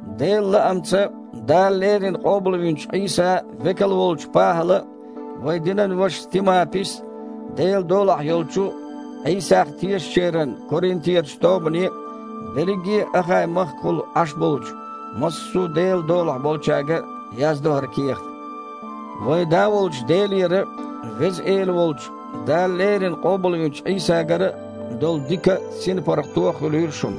Делан лаамца Дала леррина къобалвинчу Іийсан векал волчу ПахІала а, вайн динан вашас Тимапис а, Делан долахь йолчу, Іийсах тешачеран Коринтерачу тобане а, берриге Ахай-махкахула Іаш болчу массо а Делан долахь болчаьрга а яздо хІара кехат. Вайн Да волчу Делера а, Веза Эла волчу, Дала леррина къобалвинчу Іийсагара а долу дика а, синпаргІато а хуьлийла шуна.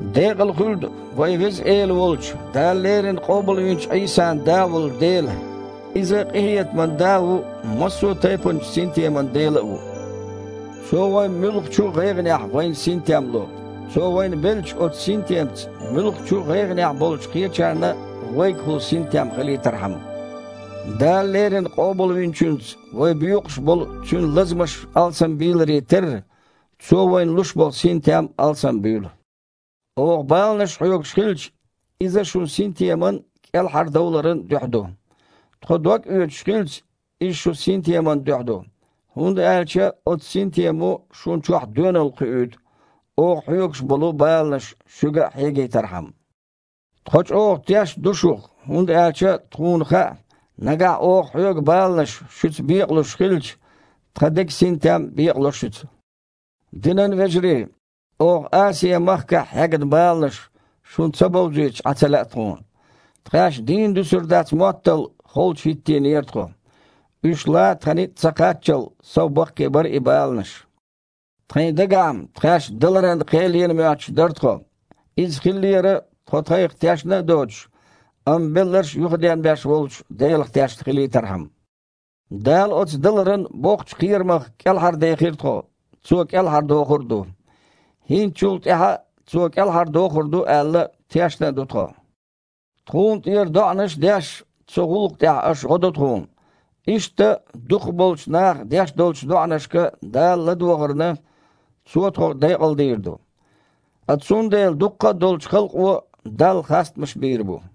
Декъала хуьлда вайн Веза Эла волчу, Дала леррина къобалвинчу Іийсан Да волу Дела. Иза къинхетаман Да а ву, массо а тайпанчу синтеман Дела а ву. Цо вайн муьлххачу а гІайгІанехь вайна синтем ло, Цо вайна беллачу оцу синтемца муьлххачу а гІайгІанехь болчу кхечарна а вайгахула синтем хилийтархьама. Дала леррина Къобалвинчуьнца вай боькъуш болу Цуьнан лазамаш алсамбийларе терра, Цо вайна луш болу синтем а алсамбуьйлу. Оха баланаш хьоьгуш хилча – иза шун синтеман а, кІелхьардовларан а дуьхьа ду. Тхо догъоьцуш хилча – иза шун синтеман дуьхьа ду, хІунда аьлча оцу синтемо шуна чохь доьналла кхуьуьйту, оха хьоьгуш болу баланаш шуьга а хьегийтархьама. Тхо чІогІа тешна ду шух, хІунда аьлча тхуна хаьа, нагахь оха хьоьгу баланаш шуьца бекъалуш хилча, тхан деган синтем а бекъало шуьца. Динан вежарий, оха Асиа-махкахь хьегна баланаш шуна ца бовзуьйтуш Іан ца лаьа тхуна. Тхаьш дийна дуьсур дац моттал холчу хІиттийнера тхо. Уьш лан тхан ницкъ ца кхаччал, сов баккхий бара и баланаш. Тхайн дагахь-м тхаьшна даларан кхел йина моьттуш дара тхо. Иза хиллера, тхо тхайх тешна а доцуш, амма белларш а юхаденбеш волчу Делах тешна хилийтархьама. Дала оцу даларан боккхачу кхерамах кІелхьардехира тхо, Цо кІелхьардохур а ду. ХІинца чул тІаьхьа а Цо кІелхьардохур ду аьлла, тешна а ду тхо. Тхуна тІера доІанаш а деш, цу гІуллакха тІехь аша гІо до тхуна. Иштта, дукхахболчу наха деш долчу доІанашка Дала ладогІарна, Цо тхо декъалдийр ду. Ткъа цундела дуккха а долчу халкъо Далла хастамаш бийр бу.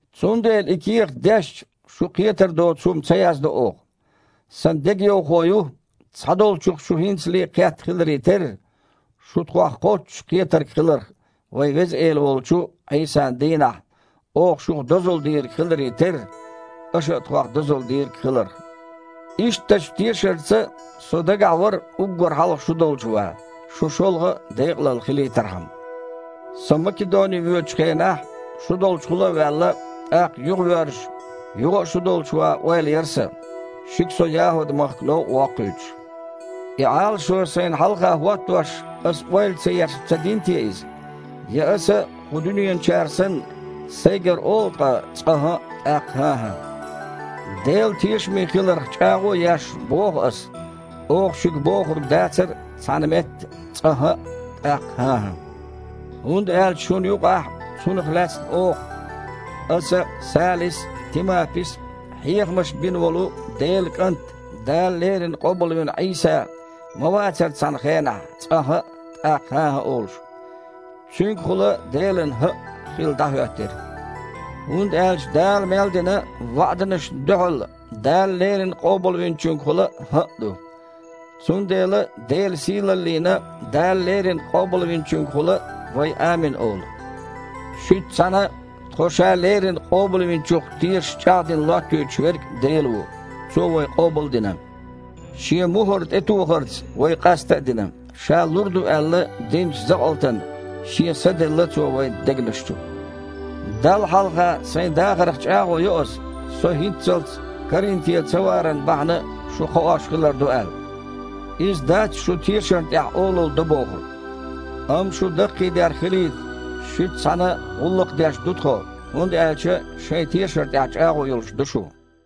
Цундела и кехат дешча, шу кхетар доцу хІума ца яздо оха. Сан дегайовхо ю, цхьадолчух-м шу хІинцале а кхетта хиларе терра, шу тхох кхоччуш кхетарг хиларх, вайн Веза Эла волчу Іийсан дийнахь оха шух дозалла дийриг хиларе терра, аша а тхох дозалла дийриг хиларх. Ишттачу тешарца со дагахь вара уггар хьалха шу долчу ван, шун шолгІа а декъалалла хилийтархьама. Со Македоне воьдучу хенахь шу долчухула а ваьлла, тІаккха, юхавоьрзуш, юха а шу долчу ван ойла яра сан, шуьга со ЯхІуд-махка новкъа а воккхуьйтуш. И Іалашо сайна хьалха хІоттош, аса ойла а ца еш-м ца дина те иза? Я аса, кху дуьненарчара санна, сайгара олу ткъа цкъа «хІаъ», тІаккха «хІан-хІа»? Дела тешаме хиларх чІагІо а еш, боху аса, оха шуьга бохург дацара цхьана метта цкъа «хІаъ», тІаккха «хІан-хІа». ХІунда аьлча шуна юкъахь Цунах лаьцна оха – аса а, Салис а, Тимапис а – хьехамаш бина волу Делан КІант, Дала леррина къобалвина Іийса, ма вацара цхьана хенахь цкъа «хІаъ», тІаккха «хІан-хІан» олуш. Цуьнгахула Делан «хІаъ» хилла дІахІоьттира. ХІунда аьлча Дала мел дина ваІданашна дуьхьал Дала леррина Къобалвинчуьнгахула «хІаъ» ду. Цундела Делан сийлаллина Дала леррина Къобалвинчуьнгахула вай « Амин» олу. Шуьца цхьаьна тхо Ша леррина Къобалвинчух тешаш чІагІдина лоттуьйтуш Верг – Дела ву. Цо вай къобал а дина, Шен мухІар тІетохарца вай къаста а дина, Ша лур ду аьлла динчу закъалтана Шен Са делла Цо вайн дегнаш чу. Далла хьалха сайн дахарх чІагІо йо ас, со хІинццалц Коринте цаваран бахьана шу кхоош хилар ду аьлла. Иза дац шун тешарна тІехь олалла до бохург. Амма шун даккхийдер хилийта шуьца цхьаьна гІуллакх деш ду тхо, хІунда аьлча шайн тешар тІехь чІагІо йолуш ду шу.